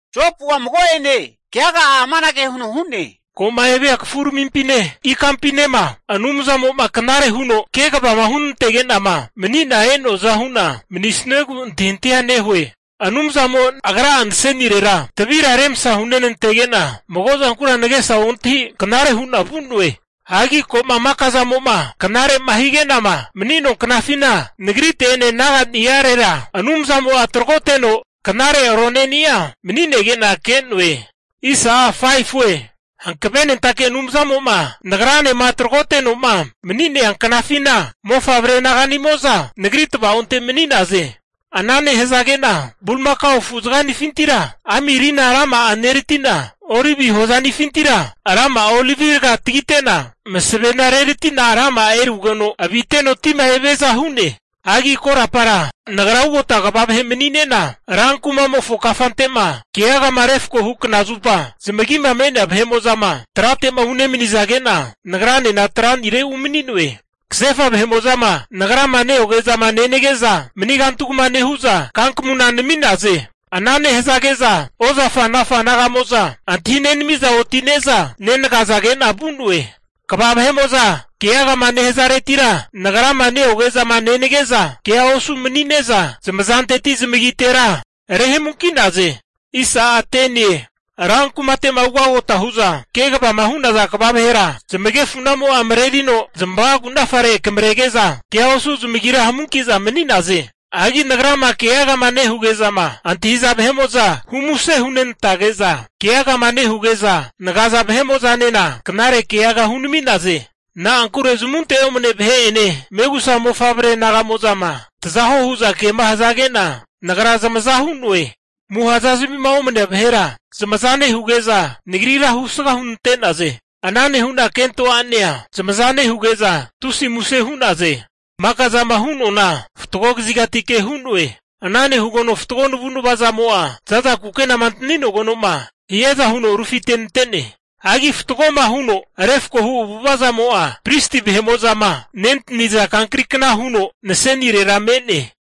Jopu'a mago'ene keaga'a amanage huno hu'ne, Ko'ma evia kafuramimpine ikampinema Anumzamo'ma knare huno kegavama hunantege'nama mani'na e'noaza hu'na, manisuegu antahintahia nehue. Anumzamo agra nasenirera tavira remsa hunentege'na, mago zankura nagesa ontahi knare hu'na vu'noe. Hagi ko'ma maka zamo'ma knare'ma higenama mani'noa knafina, nagrite'ene naga'ni'arera Anumzamo'a taragoteno knare aroneni'a mani'nege'na ke'noe. Hankavenentake Anumzamo'ma nagranema taragotenoma mani'nea knafina, mofavre naganimo'za nagri tava'onte mani'naze. Ana nehazage'na bulimakao afu zaga'nifintira ami rina rama'a nerati'na, olivi hozanifintira rama'a olivi raga tagite'na, masavena reratina rama'a erugeno viteno tima eviaza hu'ne. Hagi korapara nagra ugota kva vahe mani'ne'na, rankumamofo kafante'ma keagama refkohu knazupa, zamagima me'nea vahe'mo'zama trate'ma unemanizage'na nagranena tra'nire umani'noe. Kasefa vahe'ma nagrama neoge'zama nenage'za, mani kantugma nehu'za kankamuna nami'naze. Ana nehazage'za ozafanafa naga'mo'za, antahinenami'za oti'ne'za nenagazage'na vu'noe. Kva vahe'mo'zama keagama nehazaretira nagrama neoge'zama nenage'za, kea osu mani'ne'za zamazanteti zamagitera rehamunki'naze. Ran kumate'ma ugagota hu'za kegavama hu'naza kva vahera, zamagefunamo'a marerino zmavagunafare akamrege'za kea osu zamagira hamunki'za mani'naze. Hagi nagrama keagama nehuge'zama antahi'za vahe'mo'za hu muse hunenantage'za, keagama nehuge'za nagaza vahe'mo'zanena knare keaga hunami'naze. Na'ankure zamunte omane vahe'ene megusa mofavre naga'mo'zama, taza huo hu'za kema hazage'na, nagra zamaza hu'noe. Amuha zazamima omanea vahera zamaza nehuge'za, nagrira husga hunante'naze. Ana nehu'na kento a'nanea zamaza nehuge'za tusi muse hu'naze. Maka zama hu'noana fatgo kazigatike hu'noe. Ana nehugeno fatgo navu'nava zamo'a za'za kukenama antaninogeno'ma hiaza huno rufitenante'ne. Hagi fatgoma huno refkohu avu'ava'zamo'a, pristi vahe'mo'zama nentani'za kankrikna huno nasenirera me'ne.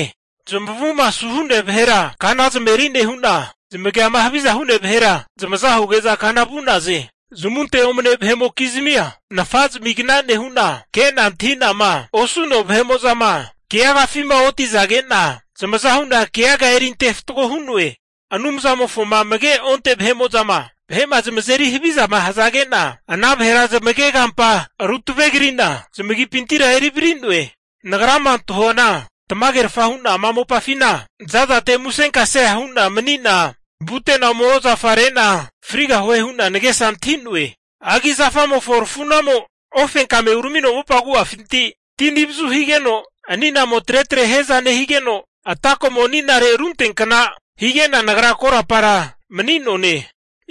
Zamavuma asuhu'nea vahera kana zamaveri nehu'na, zamagiama haviza hu'nea vahera zamaza huge'za kana vu'naze. Zamunte omane vahe'mokizmia nafa zamigna nehu'na, ke'na antahi'nama osu'noa vahe'ma keagafima otizage'na, zamaza hu'na keaga eri ante fatgo hu'noe. Anumzamofoma amage onte vahe'mo'zama vahe'ma zamazeri havizama hazage'na, ana vahera zamagemazampa ru tavegri'na, zamagipintira eri vari'noe. Nagrama antahuana, tamagerfa hu'na ama mopafina zazate musenkasea hu'na mani'na vute'na ome ozafa re'na frigahue hu'na nagesa antahi'noe. Hagi zafamofo rafu'namo ofenkame uramino mopa agu'afinti ti anivazu higeno ani'namo tretre hiaza nehigeno atako'mo aninare runteankna hige'na nagra korapara mani'noane.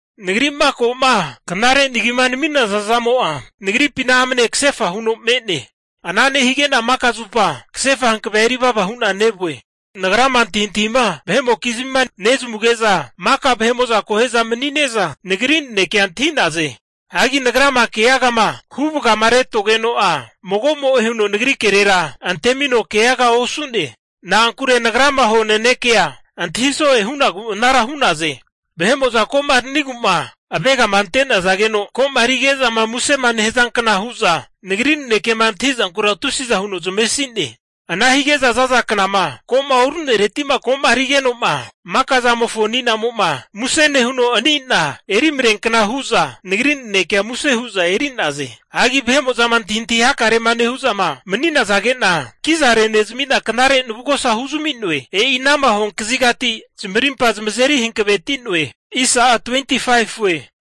Nagri'ma ko'ma knare nagima nami'naza zamo'a nagripina amne kasefa huno me'ne. Ana nehige'na maka zupa kasefa hankavea erivava hu'na nevue. Nagrama antahintahima vahe'mokizmima nezamuge'za, maka vahe'mo'za akohe'za mani'neza, nagri nanekea antahi'naze. Hagi nagrama keagama huvagama retogeno'a, mago'mo'e huno nagri kerera antemino keaga osu'ne. Na'ankure nagrama hua nanekea antahiso'e hu'nagu anara hu'naze. Vahe'mo'za komaranigu'ma avegama ante'nazageno koma rige'zama musema nehazankna hu'za, nagri nanekema antahi'zankura tusiza huno zamavesi'ne. Ana hige'za za'za knama ko'ma oru'nereti'ma ko'ma rigeno'ma maka zamofo ani'namo'ma muse nehuno ani'na eri mareankna hu'za nagri nanekea muse hu'za eri'naze. Hagi vahe'mo'zama antahintahi hakarema nehu'za mani'nazage'na, kiza renezami'na knare navugosa huzami'noe. E'inama hua kazigati zamarimpa zamazeri hankaveti'noe.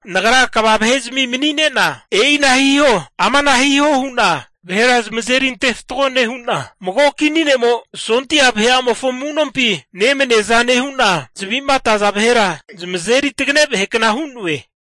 Nagra kva vahezmi mani'ne'na, e'ina hiho, amana hiho hu'na vahera zamazeri ante fatgo nehu'na, mago kini ne'mo sondia vahe'amofo amu'nompi nemaniaza nehu'na, zavi'ma ataza vahera zamazeri tagane vahekna hu'noe.